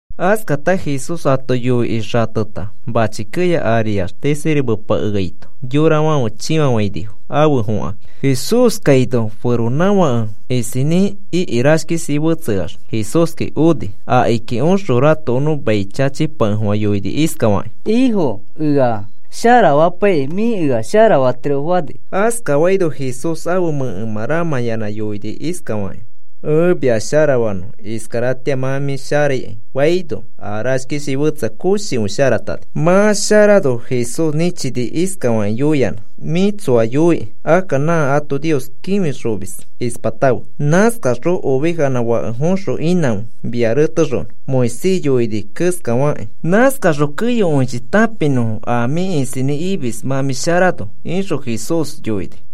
Askata Jesús ato yoikĩ xateta mãchi keya ariax tisirimepakeaito yorafãfe chĩfafainifo afe fõkakĩ. Jesús kaino feronãfake isinĩ iki rashkishi fetseax Jesúski oni. Akiki oxõ ratokonõ mai chachipakefofã yoini iskafakĩ: “Ifo, ea sharafapaikĩ mĩ ea sharafatiro,” fani. Askafaino Jesús ãfe mẽkemã ramãyanã yoini iskafakĩ: “Ẽ mia sharafanõ. Iskaratĩa mĩ sharaikai,” faino, a rashkishi fetseai koshikõi sharatani. Mã sharano Jesús nĩchini iskafakĩ yoiyanã: “Mĩ tsoa yoiki. Akka nã ato Nios kĩfixomis ispatãfe. Nãskaxõ ovejanã fake foxõ inãfe mia retexonõ Moisés yoini keskafakĩ. Nãskaxõ keyokõichi tãpinõfo a mĩ isinĩ imis mã mĩ sharano,” ixõ Jesús yoini.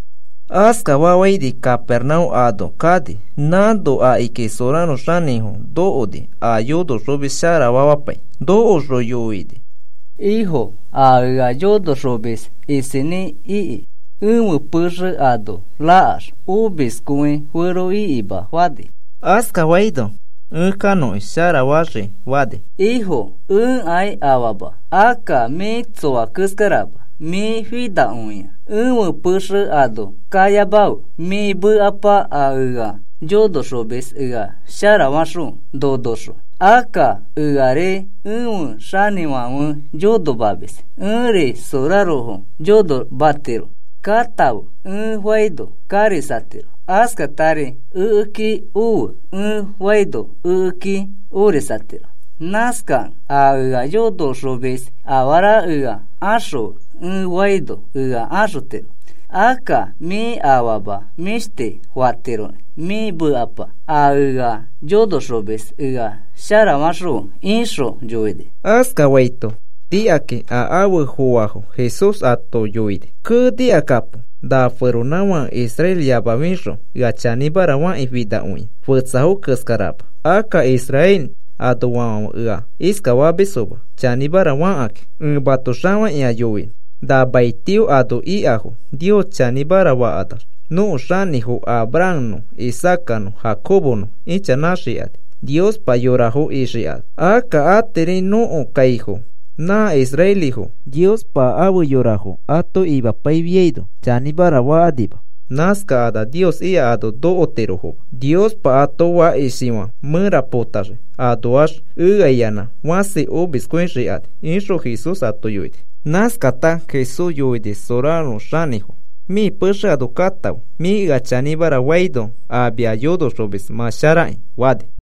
Askafafãini Capernaúm ano kani. Nãno akiki soraro xanĩfo nokoni a yonoxomis sharafamapai. Nokoxõ yoini: “Ifo, a ea yonoxomis isinĩ iki. Ẽfe pexe ano rakax omiskõiferoikima,” fani. Askafaino, “Ẽ kanõkĩ sharafaxikĩ,” fani. “Ifo, ẽkai afama. Akka mĩ tsoa keskarama. Mĩ finakõiakĩ ẽfe pexe ano kayamafe. Mĩ mekapa a ea yonoxomis ea sharafaxõfe nonoxõ. Akka eari ẽfe xanĩfãfe yonomamis. Ẽri sorarofo yonomatiro. ‘Katãfe,’ ẽ faino karisatiro. Askatari, ‘Ekeki ofe,’ ẽ faino ekeki orisatiro. Nãskakẽ a ea yonoxomis afara ea axõfe ẽ faino ea axotiro. Akka mĩ afama mĩshti fatiroki. Mĩ mekapa a ea yonoxomis ea sharafaxõfe,” ixõ yoini. Askafaito nikakĩ a afe foafo Jesús ato yoini: “Kee, nikakapo. Na feronãfake israeliyamafixõ ea chanĩmara fakĩ finakõi fetsafo keskarama. Akka Israel anoafãfe ea iskafamisfoma chanĩmara fakakĩ. Ẽ mato xafakĩa yoinõ. Na maitio ano ikafo Nios chanĩmara fakanax nõko xinifo Abrahamnõ Isaacanõ Jacobonõ ichanãxikani Nios yorafo ixikakĩ. Akka atiri nõko kaifo nã israelifo Niospa afe yorafo ato imapaifiaino chanĩmara fakanima. Nãskakanax Nios ika ano nokotirofoma. Niospa ato fakishifã mẽra potaxii. Anoax eaiyanã fasi omiskõixikani,” ixõ Jesús ato yoini. Nãskata Jesús yoini soraro xanĩfo: “Mĩ pexe ano katãfe. Mĩ ea chanĩmara faino a mia yonoxomis mã sharaki,” fani.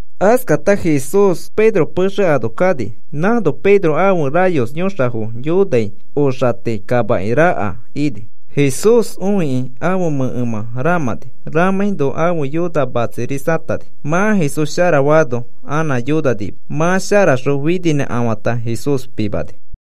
Askata Jesús Pedro pexe ano kani. Nãno Pedro ãfe rayos yõxafo yonai oxati kamaki raka ini. Jesús õikĩ ãfe mẽkemã ramãni. Ramãino ãfe yona matsirisatani. Mã Jesús sharafaano anã yonanima. Mã sharaxõ fininãkafãta Jesús pimani.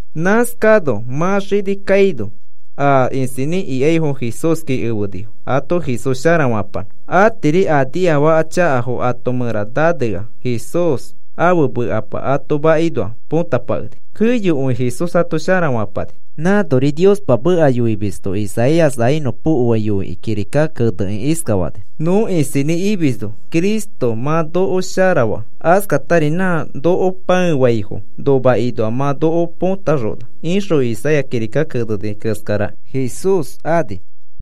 Nãskano mã xini kaino a isinĩ ikaifo Jesúski efenifo ato Jesús sharafapanõ. Atiri a niafaka chakafo ato mẽra nanea Jesús ãfe mekapa ato makinoa põtapakeni. Keyokõi Jesús ato sharafapani. Nãnori Niospa meka yoimisto Isaías a inõpokoai yoikĩ kirika kenekĩ iskafani: “Nõ isinĩ imisno Cristo mã noko sharafaa. Askatari nã noko pãefaifo nomakinoa mã noko potaxona,” ixõ Isaías kirika keneni keskara Jesús ani.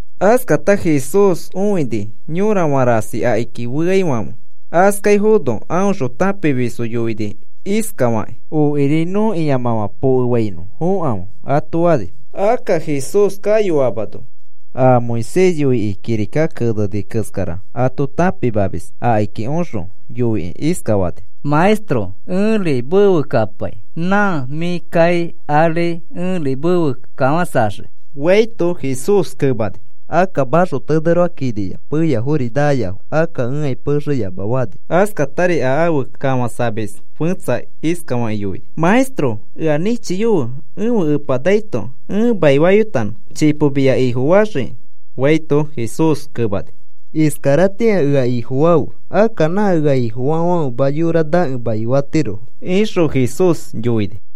Askata Jesús õini yorafã rasi akiki feaifãfe. Askaifono aõxõ tãpimisfo yoini iskafakĩ: “Okiri nõ ĩamãfã pokefainõ fokãfe,” ato fani. Akka Jesús kayoamano a Moisés yoikĩ kirika keneni keskara ato tãpimamis akiki oxõ yoikĩ iskafani: “Maestro, ẽri mefe kapai nã mĩ kai ari ẽri mefe kafãsaxiki,” faito, Jesús kemani: “Akka maxoteneroa kiniya, peyafori naayafo akka ẽkai pexe yama,” fani. Askatari a afe kafãsamis fẽtsa iskafakĩ yoini: “Maestro, ea nĩchiyofe ẽfe epa naito ẽ maifayotanõ. Chipo mia Ifofaxiki,” faito, Jesús kemani: “Iskaratĩa ea Ifofafe. Akka nã ea Ifofaafãfema yora nakẽ maifatirofo,” ixõ Jesús yoini.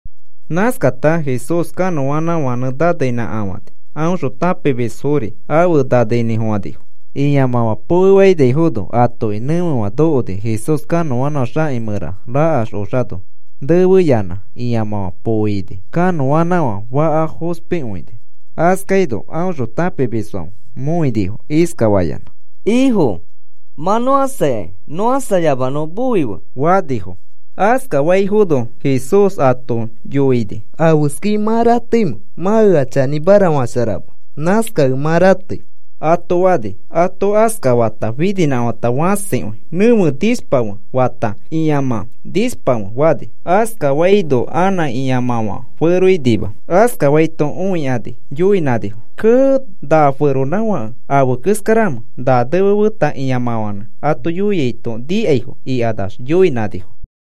Nãskata Jesús kanõanãfãnẽ naneinĩkafãni aõxõ tãpimisfori afe naneinĩfofãnifo. Ĩamãfã pokefainaifono atoki nẽfefã nokoni. Jesús kanõanãfã xaki mẽra rakax oxano nefeyanã ĩamãfã poo ini. Kanõanãfã faka fospikõini. Askaino aõxõ tãpimisfãfe mõinifo iskafayanã: “¡Ifo, mã nõ ãsaikai! ¡Nõ ãsayamanõ moife!” fanifo. Askafaifono, Jesús ato yoini: “¿Afeskai mã rateimẽ? Mã ea chanĩmara fasharama. Nãskakẽ mã ratei,” ato fani. Ato askafata, fininãkafãta fãsikõi, “¡Nẽfe, nishpafe!” fata, “¡Ĩamã, nishpafe!” fani. Askafaino anã ĩamãfã feroinima. Askafaito õikani yoinãnifo: “¡Kee! ¿Na feronãfake afe keskaramẽ na nefe feta ĩamãfãnẽ ato yoiaito nikaifo?” ikanax yoinãnifo.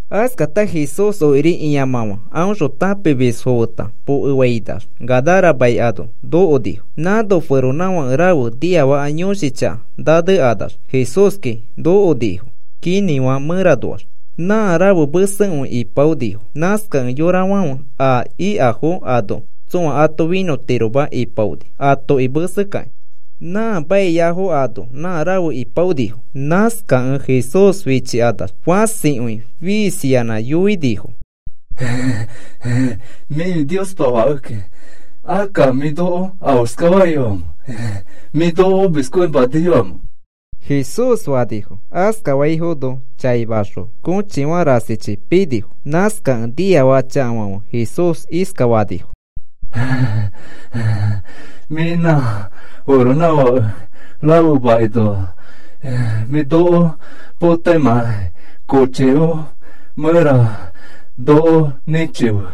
Askata Jesús okiri ĩamãfã aõxõ tãpimisfo feta pokefainax Gadara mai ano nokonifo. Nãno feronãfake rafe niafaka yõshi chaka nanekanax Jesúski nokonifo kinĩfã mẽranoax. Nã rafe mesekõi ipaonifo. Nãskakẽ yorafãfe a ikafo ano tsõa ato finõtiroma ipaoni atoki mesekakĩ. Nã maiyafo ano nã rafe ipaonifo. Nãskakẽ Jesús fichikanax fãsikõi fiisiyanã yoinifo: “Mĩfi Niospa Fakeki. Akka, ¿mĩ noko afeskafaiyoamẽ? ¿Mĩ noko omiskõimaniyoamẽ?” Jesús fanifo. Askafaifono chaimaxõ kõchifã rasichi pinifo. Nãskakẽ niafaka chakafãfe Jesús iskafanifo: “Mĩ nã feronãfake rafe makinoa mĩ noko potaimãkai kochifo mẽra noko nĩchife,”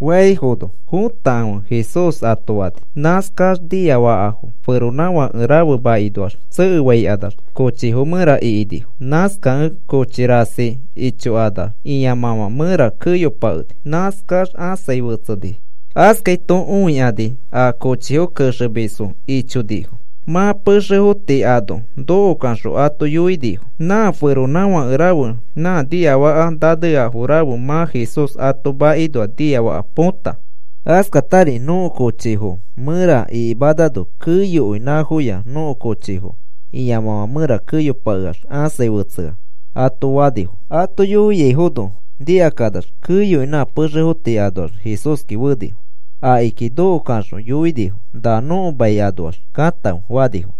faifono, “Fotakãfe,” Jesús ato fani. Nãskax niafakafo feronãfake rafe makinoax tsekekanax kochifo mẽra ikinifo. Nãskakẽ kochi rasi ichoax ĩamãfã mẽra keyopakeni. Nãskax ãsai fetseni. Askaito õikani a kochifo kexemisfo ichonifo. Mã pexefo tii ano nokokaxõ ato yoinifo: “Nã feronãfake rafe nã niafaka naneafo rafe mã Jesús ato makinoa niafaka põta. Askatari nõko kochifo mẽra ikimanano keyokõi nãfoya nõko kochifo ĩamãfã mẽra keyopakeax ãsai fetsea,” ato fanifo. Ato yoiaifono nikakanax keyokõi nã pexefo tii anoax Jesúski fenifo. Akiki nokokaxõ yoinifo: “Na nõko mai anoax katãfe,” fanifo.